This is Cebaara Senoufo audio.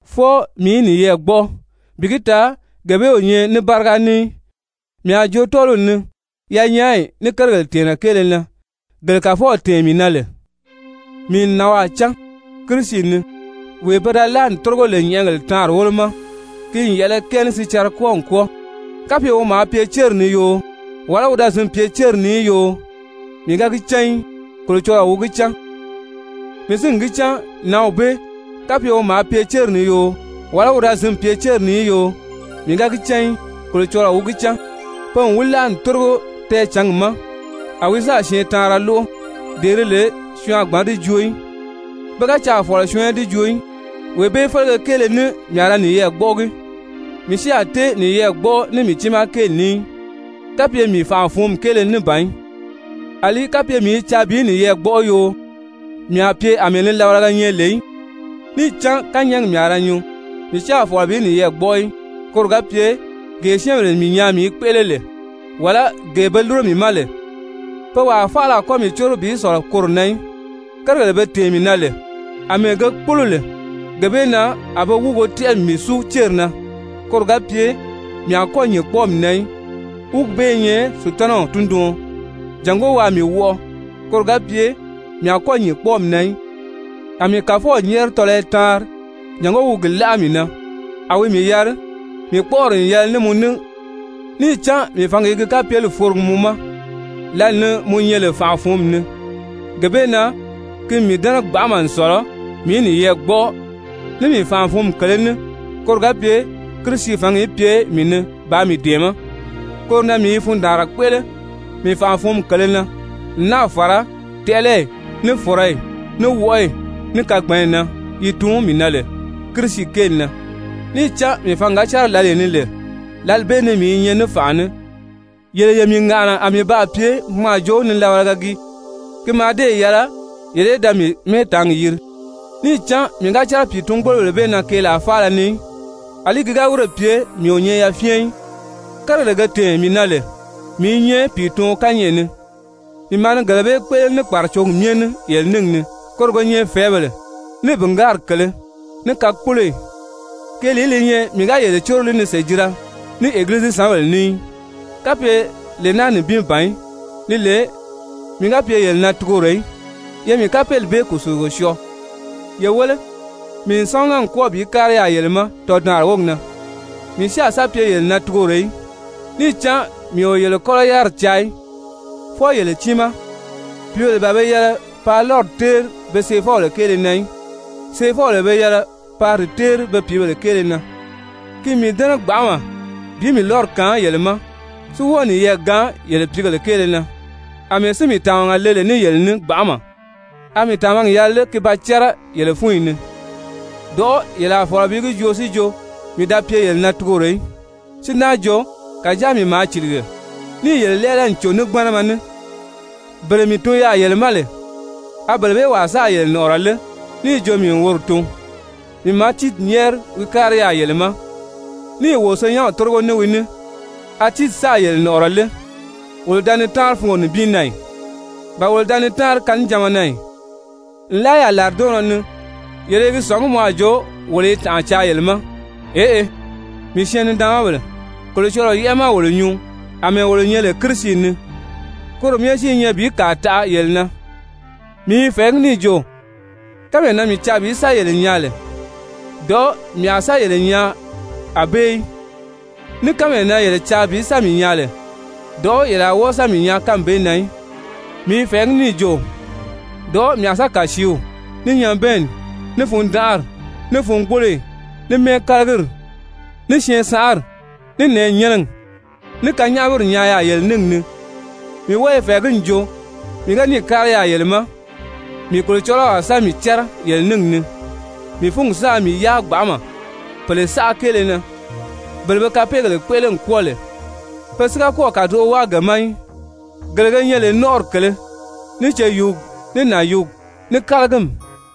Fwɔɔ mii í niyɛɛ gbɔ́ʔɔ, bi gi taa gee bee o nyɛ ní báriga ní í. Mii a jo tɔ́ɔliw ni yanyaayi ní kérigèle tɛ̀ɛnnɛ kéele na gele Kàfɔw tɛ̀ɛn mii na lè. Mii n nànwaa cán Kirisi ni, wee pe da láa n tórigo lè nyɛ̀ʔɛgèle taanri wólo ma, ki n yɛ̀ʔɛlɛ kɛɛ ní sicɛrɛ kwɔ́ɔ n kwɔ́ɔ, (kapye wi maa pye céri ni yoo, wàlá wi da zǐn pye céri ni í yoo, mii ga gi cán í, Kolocɔlɔɔ wi gi cán.) Mii si n gi cán nǎnw bee, (kapye wi maa pye céri ni yoo, wàlá wi da zǐn pye céri ni í yoo, mii ga gi cán í, Kolocɔlɔɔ wi gi cán,) pe n wi láa n tórigo tɛɛcǎngi ma, a wi sáà syɛɛntaanra lóʔo, dee di lè syɔɔn a gbǎn di joo í, pe ga caà fɔ̀lɔ syɔɔn í di joo í. Wee bee félege kéele ní mii a ra niyɛɛ gbɔ́ʔɔgi, mii si a tée niyɛɛ gbɔ́ʔɔ ní mii tiimaa kéeli ní í, kapye mii fànʔa-fǔnmi kéele ní ban í. Alí kapye mii i caa bi niyɛɛ gbɔ́ʔɔ yoo, mii a pye àmɛɛ nilabalaga nyɛ lè í, níì cán kányɛɛgi mii a ra nyuu. Mii si a fɔ̀lɔ bi niyɛɛ gbɔ́ʔɔ í, koro ga pye gee syɛ́ɛnbèle mii nyaa mii i kpéʔele lè, wàlá gee be lúro mii ma lè, pe wàa faala a kɔ́ mii córo bi sɔ̀lɔ koro na í. Kérigèle be tɛ̀ɛn mii na lè àmɛɛ ge kpólo lè, gee bee na a be wúugo tɛ́ʔɛ n mii súu céri na, koro ga pye mii a kɔ́ nyìn kpɔ́ɔmi na í, wúugi bee i nyɛ Sutanaw tunduɔn jàngó waa mii wɔʔɔ, koro ga pye mii a kɔ́ nyìn kpɔ́ɔmi na í. A mii Kàfɔw nyɛ́ɛri tɔlɔyɔ taanri jàngó wi gi láʔa mii na, a wi mii yari: «Mii kpɔ́ʔɔri n yɛlɛ ní mɔ ní, níì cán mii fǎngi i gi kapyeli forogi mɔ ma lǎli ni mɔ nyɛ lè fànʔa-fǔnmi ni.» Gee bee na ki n mii dɛ́nɛ gbanʔama n sɔ̀lɔ mii í niyɛɛ gbɔ́ʔɔ ní mii fànʔa-fǔnmi kèlē ní, koro ga pye Kirisi fǎngi í pye mii ni bàā mii dɛ̀ɛmɛ́. Koro na mii i fundaanra kpéʔele mii fànʔa-fǔnmi kèlē na, n náà fàra tɛʔɛlɛyi, ní fɔ̀rɔyi, ní wɔʔɔyi, ní kagbanyi na yi tuun mii na lè Kirisi kéeli na. Níì cán mii fǎngi ga cɛ́rɛ lǎlee ni lè, lǎli bee ni mii nyɛ ní fànʔa ní. Yele ye mii ŋàʔana a mii baa pye mɔ a jo nilabalaga gii. Ki mǎà dée yɛlɛ yele í da mii mɛ́ɛtaangi yiri. Níì cán mii ga cɛ́rɛ pìitun-gbólobèle bee na keelaa faala ni í, àlí ki ga wírè pye mii o nyɛ yafyɛn í. Kérigèle ge gi tɛ̀ɛn lè mii i nyɛ pìituɔn kányɛʔɛ ni, mii maa ni gele bee kpéʔele ní kpàracogi myɛ ní yele níngi ni, koro ge nyɛ fɛ̀ɛ́bèle, ní bìngaari kèlē, ní kakpoloyi. Keelìí li nyɛ mii ga yele córo li ni sèjira ní egilizisanbèle ní í, kapye lee naa nibin ban í, li lè mii ga pye yele na tugoro í? Ye mii kapeeli bee kùsulugo syɔɔ! Ye wéle, mii n sámaga n kwɔ́ɔ bi kári yaà yele ma tɔdaanri wógi na, mii si a sa pye yele na tugoro í. Níì cán mii o yele kɔ́lɔ yáriri caa í, fwɔɔ yele tiimaa. Pìíbèle ban be yɛlɛ paa lɔ́ri téeri be seefɔbèle kéele na í, seefɔbèle be yɛlɛ paa di téeri be pìíbèle kéele na. Ki n mii dɛ́nɛ gbanʔama bi mii lɔ́ri kaan yele ma si wɔ́ɔ niyɛɛ gaan yele pìígèle kéele na. Amɛɛ si mii tàmaga le ní yele ní lè gbanʔama, a mii tàmagi yɛlɛ lé ki ba cɛ́rɛ yele fúnyi ni? Dɔ̀ʔɔ́ yele a fɔ̀lɔ bi gi joo si jo mii da pye yele na tugoro í, si náa jo kàjáa mii maa cìlige, níì yele lɛ́ɛlɛ n cò ní gbánama ní. Bele mii tun yaà yele ma lè, a bele bee wàa sáà yele nɔ̀ʔɔrɔ lé níì jo mii wi woro tun? Mii maa Tiiti nyɛ́ɛri wi kári yaà yele ma, níì wo senyɛnw tórigo ní wi ní, a Tiiti sáà yele nɔ̀ʔɔrɔ lé? Wolo da ni táanri fungo nibin na ì? Ba wolo da ni táanri kannijanma na ì? Nlaa yaà làridɔɔnnɔ ni yele i gi sɔ̀ngí mɔ a jo wolo i tànʔa caa yele ma. Eʔe, mii syɛɛn-nidaanmabèle, Kolocɔlɔɔ yɛ́ʔɛ ma wolo nyuu àmɛɛ wolo nyɛ lè Kirisi ni, koro myɛ si i nyɛ bi kàa taʔa yele na. Mii i fɛ̀ɛgí níì jo kánmee na mii caa bi sa yele nyaa lè, dɔ̀ʔɔ́ mii a sa yele nyaa ànbée í, ní kánmee na yele caa bi sa mii nyaa lè, dɔ̀ʔɔ́ yele a wɔ́ɔ sa mii nyaa kánmi bee na í. Mii i fɛ̀ɛgí níì jo dɔ̀ʔɔ́ mii a sa kàsiiw, ní nyabɛɛnni, ní fundanʔari, ní fungboloyi, ní mɛ́ɛkalagiri, ní syɛɛnsanʔari, ní nɛ̀ɛnyɛnɛgi, ní kanyaʔamiri nyaa yaà yele níngi ni. Mii wɔ́ɔ i fɛ̀ɛgí n jo mii ga níì kári yaà yele ma, mii Kolocɔlɔw a sa mii cɛ́rɛ yele níngi ni, mii fúngi sáā mii yáa gbanʔama pèle saʔa kéele na, bele be kapeegèle kpéʔele n kwɔ́ɔ lè, pe si ga kɔ́ɔ̀ kàdoʔo wáa ge ma í, gele ge nyɛ lè nɔ́nʔɔri kèlē, ní ceyuugi, ní nànyuugi, ní kálagimi.